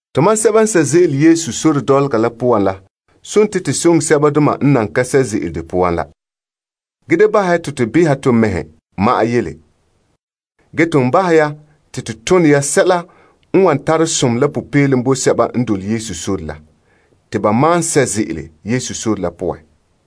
Tomam sɛba n sɛ' ze'ele Yesu sore dɔlɔga la poan la dela to soŋɛ sɛbadoma n nan ka sɛ' ze'ele de poan la. Ge da bahɛ ya te to behɛ la to mɛhe ma'an yele. Ge ton bahɛ ya te to tone ya sɛla n wan tara som la popeelom bo sɛba n dole Yesu sore la, te ba malom sɛ' ze'ele Yesu sore la poan.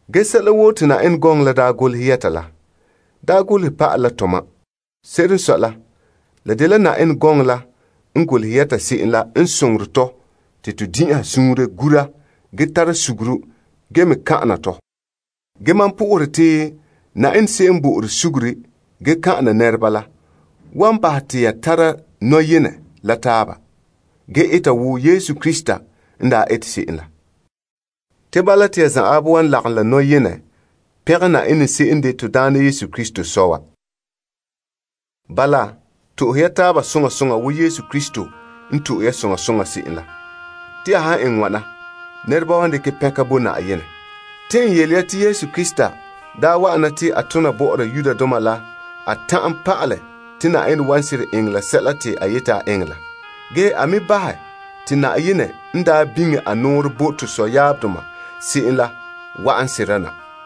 Ge sɛla woo n golehɛ yɛta la, daa golehɛ pa'ala la tomam. Se'ere n sɔe la la dela Yenɛ gɔŋɔ la n golehɛ yɛta se'em la n soŋorɛ tɔ te to din'inha suunre gura ge tara suguru ge me kan'ana tɔ. Ge mam sohore Yenɛ se'em n bo'ore sugure ge kan'ana nɛreba la, wan bahɛ ya te ya tara nɔyenɛ la taaba. Ge eta wo Yesu Krista n daa ete se'em la. Te bala te ya zanwaabe wan lagom la nɔyenɛ pɛngɛ Yenɛ se'em n de to Daana Yesu Krista Sɔ' wa. Bala, to'ohe ya taaba soŋa soŋa wo Yesu Krista n to'e ya soŋa soŋa se'em la. Te ya han eŋɛ wana, nɛreba wan dekɛ pɛnka bo Yenɛ. Te n yele ya te Yesu Krista daa wa'ana te a tona bɔ'ɔra Yudoma la a ta'an pa'alɛ te Yenɛ wan seren eŋɛ sɛla te a yeti a eŋɛ la. Ge a me bahɛ te Yenɛ n daa biŋe a nɔɔrɛ bo tɔ sɔyaabdoma se'em la wa'an sera na.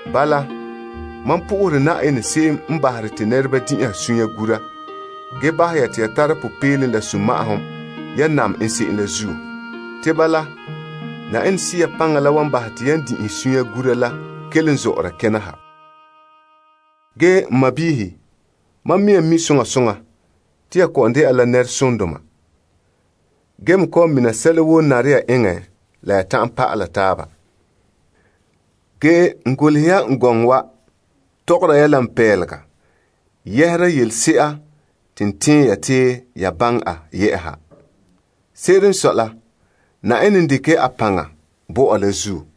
Bala, mam sohore Yenɛ se'em n bahere te nɛreba din'inha sunya gura bahɛ ya te ya tara popeelom la sunma'ahom yan nam en se'em la zuo. Te bala, Yenɛ Sea paŋa la wan bahɛ te yan din'inhe sunya gura la kelom zɔ'ɔra kena ha. Ge n sɔɔnrɔ, mam mea mi' soŋa soŋa te ya kɔ'ɔn dɛna la nɛresondoma. Ge me kɔ'ɔn mina sɛla woo n nare ya eŋɛ la ya ta'an pa'ala taaba. Ge n golehɛ ya gɔŋɔ wa tɔgɔrɛ ya n pelega yɛhera yɛla a se'a te n tɛn ya te ya baŋɛ yɛ'ɛha. Se'ere n sɔe la, Yenɛ n dekɛ a paŋa bo mam la zuo,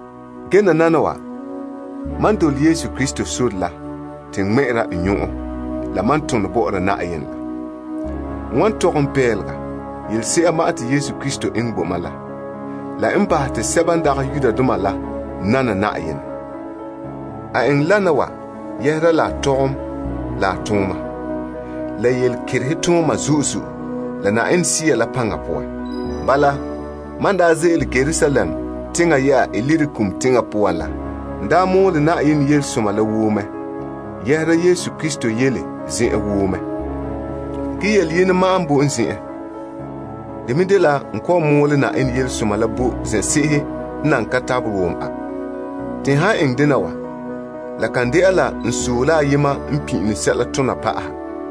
Ge nananawa mam dole Yesu Krista sore la te n ŋmɛ'ɛre n nyɔn'ɔn la mam tone bɔ'ɔra Yenɛ la. N wan tɔgɛ la boraanɛ yelese'a te Yesu Krista eŋɛ bo mam la, la n bahɛ te sɛba n dagɛ Yudoma la nana Yenɛ. A eŋɛ wana wa doohe la tɔgom la tooma, la yelekerehe tooma zo'e zo'e la Yenɛ Sea la paŋa poan. Bala, mam n daa ze'ele Yerusalem teŋa yɛ'a Ilirikum teŋa poan la, n daa mɔɔlɛ Yenɛ yelesoma la woo mɛ yɛhera Yesu Krista yele zen'an woo mɛ. Ge yele yenɛ ma'an n boe mam zen'an. De me dela n kɔ'ɔn mɔɔlɛ Yenɛ yelesoma la bo zen'se'ehe n nan ka tabelɛ wom a. Te n han eŋɛ dena wa, la kan dɛna la n sɔe la ayema n pin'ilom sɛla tona pa'aha.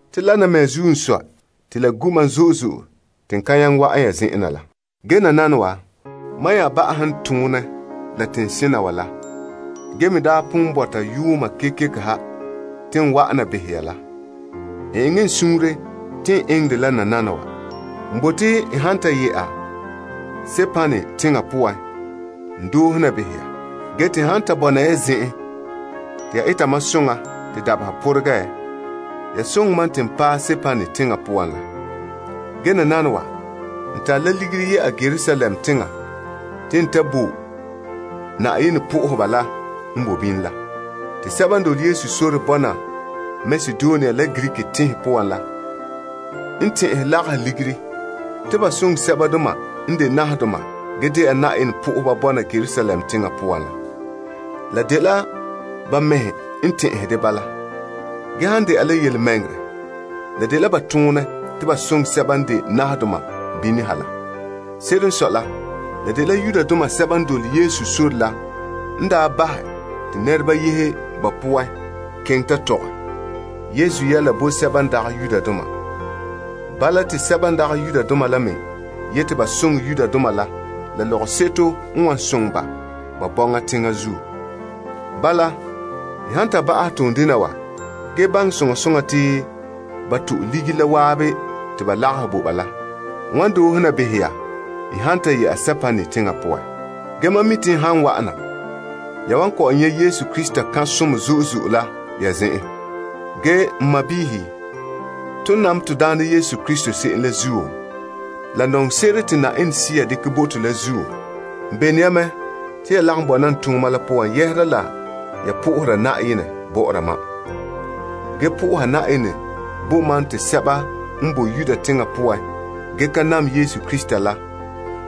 Te wana mea zuo n sɔe te la gu' mam zo'e zo'e te n nyaŋɛ wa'an ya zen'an na la. Ge nananawa, mam nya ba'ahɛ n tone la teŋsena la, ge me daa pon bɔta yuuma kekeko ha te n wa'an na behɛ ya la, n eŋɛ n suunre te n eŋɛ dɛ la nananawa. N bote n han ta yɛ'a Spain teŋa poan, n doohe na behɛ ya. Gee te n han ta bɔna ya zen'an te ya eta mam soŋa te dabeha pɔregɛ, ya soŋa mam te n paɛ Spain teŋa poan la. Ge nananawa, n yɛ'a Yerusalem teŋa te n ta soŋɛ Yenɛ nɛreba la n boe bini la. Sɛba n de Yesu lagaŋɔ bɔna Makedonia la Greek teŋhe poan la, tɛn'ɛhɛ lagahɛ ligiri te ba soŋɛ sɛbadoma n de nahadoma ge dɛna Yenɛ nɛreba bɔna Yerusalem teŋa poan la. La dela ba mɛhe n tɛn'ɛhɛ dɛ bala. Ge han dɛna la yelemɛŋɛrɛ, la dela ba toonɛ te ba soŋɛ sɛba n de nahadoma bini ha la. Se'ere n sɔe la, la dela Yudoma sɛba n dole Yesu sore la n daa bahɛ te nɛreba yehe ba poan keŋɛ ta tɔgɛ Yesu yɛla bo sɛba n dagɛ Yudoma. Bala, te sɛba n dagɛ Yudoma la me yeti ba soŋɛ Yudoma la la lɔgɔseto n wan soŋɛ ba ba bɔŋa teŋa zuo. Bala, n han ta bahɛ toondena wa ge baŋɛ soŋa soŋa te ba to'e ligiri la waabe te ba lagahɛ bo ba la n wan doohe na behɛ ya han ta yɛ'a Spain teŋa poan. Ge mam mi' te n han wa'an na, ya wan kɔ'ɔn nyɛ' Yesu Krista kan' som zo'e zo'e la ya zen'an. Ge n sɔɔnrɔ, ton nam to Daana Yesu Krista se'em la zuo, la nɔŋɔ se'ere te Yenɛ Sea dekɛ bo to la zuo, n bene ya mɛ te ya lagom la mam n tooma la poan sohora Yenɛ bɔ'ɔra mam. Ge soha Yenɛ bo mam te sɛba n boe Yudea teŋa poan ge ka nam Yesu Krista la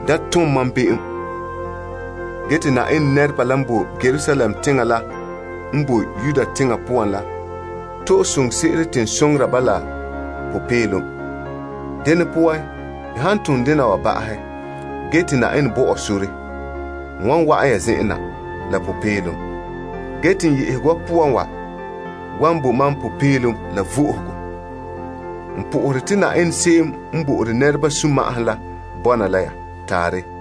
da ton mam be'em. Ge te Yenɛ nɛreba la n boe Yerusalem teŋa la n boe Yudea teŋa poan la to'e soŋorɛ se'ere te n soŋora ba la la popeelom. Dene poan, n han ton dena wa ba'ahɛ, ge te Yenɛ bo ɔ sore, n wan wa'an ya zen'an na la popeelom. Ge te n yehego wa poan wa wan bo mam popeelom la vo'ohogo. N sohore te Yenɛ se'em n bo'ore nɛreba sunma'ahom la bɔna la ya. Taarɛ.